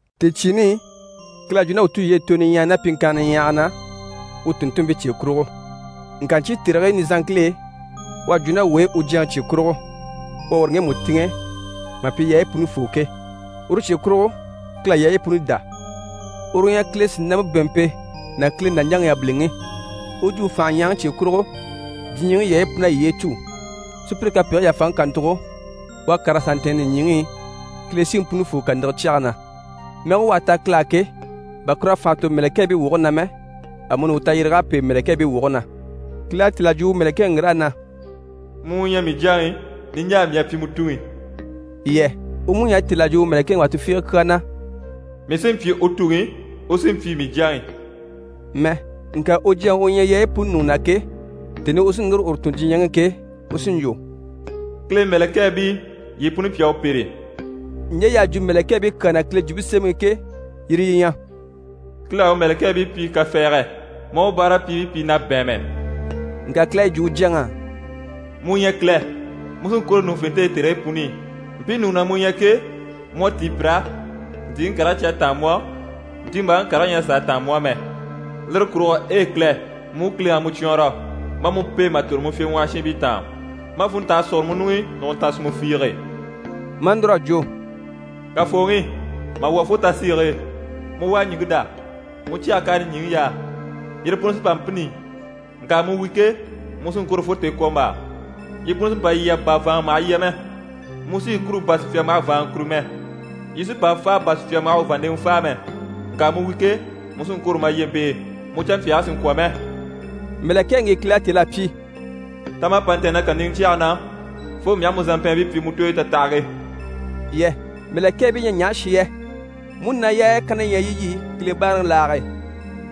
Tèecyiini i, Kile à jwo ná wuu tulyeyi i tooyo niɲyahaya ná pyiŋkannigii niɲyahagii na u tùnntunmpii cye kurugo. Ŋka ɲcyii tèrigii nizanŋkil'e, u à jwo ná wuu e u Jyaŋi cye kurugo, u à uru ŋgemu tìŋɛ mà pyi yaayi punifoo ke, uru cye kurugo Kile à yaayi puni dá. Uru u ɲyɛ Kile sìnampe bɛ̀ɛnmpe ná Kile nàɲjaŋi yabiliŋi. U jwumpe fànhe ɲyahaŋi cye kurugo, diɲyɛŋi yaayi pun'à yiye cû. Sùpyire kapegigii yàfaŋi kàntugo, u à kàr'a sà ntɛ̀ɛn nìɲyiŋi i Kile Siŋi Punifoo kàniŋɛ cyɛge na. Mɛge u à ta Kile á ke, bà kur'à fànha tò mɛ̀lɛkɛɛbii woge na mɛ, amuni u tayyéreg'à pêe mɛ̀lɛkɛɛbii woge na. Kile à têl'a jwo u mɛ̀lɛkɛŋi ŋgir'á na: «Mu u ɲyɛ mii Jyaŋi, niɲjaa mii à pyi mu Tuŋi» yɛ? U mú ɲyɛ a têl'a jwo mɛ̀lɛkɛŋi wà tufiige kyaa na: «Mii sí n‑pyi u Tuŋi, u sí n‑pyi mii Jyaŋi» mɛ. Ŋka u Jyaŋi u ɲyɛ yaayi puni ɲùŋɔ na ke, tèni i u sí núru uru tun diɲyɛŋi i ke, u sí n‑jwo: «Kile mɛ̀lɛkɛɛbii, yii puni pi a u pêre.» Ɲje y'à jwo mɛ̀lɛkɛɛbii kyaa na Kile Jwumpe Semɛŋi i ke, yire yi ɲyɛ: «Kile à u mɛ̀lɛkɛɛbii pyi kafɛɛgɛ, maa u báarapyiibii pyi na bɛ̀ɛnmɛ.» Ŋka Kile à yi jwo u Jyaŋi á: «Mu u ɲyɛ Kile, mu sí n‑kwôro ɲùŋufente e tèrigii puni i. Mpii ɲùŋɔ na mu ɲyɛ ke, mu à tíi pir'á. Ntìiŋi karigii cyi à táan mu á, ntiimbaaŋi karigii ɲyɛ a sàa táan mu á mɛ. Lire kurugo, e Kile! Mu u Kileŋi à mu cwɔɔnrɔ, maa mu pêe mà tòro mu fyèɲwɔhɔshiinbii taan, maa funntange sùguro mu ɲuŋ'i nùguntan sìnmɛ fiige.» Maa núr'à jwo: «Kafooŋi, mà lwɔ́ fo tasiige e, mu u à ɲìŋke dá, mu cyɛge k'à nìɲyiŋi yaa. Yire puni sí n‑pa n‑pînni, ŋka mu wi ke, mu sí n‑kwôro fo tèekwombaa. Yi puni sí n‑pa lyɛ bà vàanŋa maha lyɛ mɛ. Mu sí yi kûru bà sùpya maha vàanŋa kûru mɛ, yi sí n‑pa fáa bà sùpya maha u vàanndeŋɛ fáa mɛ. Ŋka mu wi ke, mu sí n‑kwôro ma lyempe e, mu canmpyaagii sì n‑kwɔ̀ mɛ.» Mɛ̀lɛkɛŋi ŋgi Kile à têl'a pyi: «Ta ma a pa ntɛ̀ɛn na kàniŋɛ cyɛge na, fo mii aha mu zàmpɛɛnbii pyi mu tooyi tatahage» yɛ? Mɛ̀lɛkɛɛbii ɲyɛ ɲaha shi yɛ? Múnaa yaaya kanna yi ɲyɛ yi yi Kile báaraŋi laage e.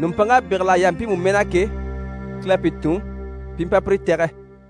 Nùmpanŋk'à bégel'a yaha mpiimu mɛɛ na ke, Kile à pi tun pi i mpa pire tɛ̀gɛ.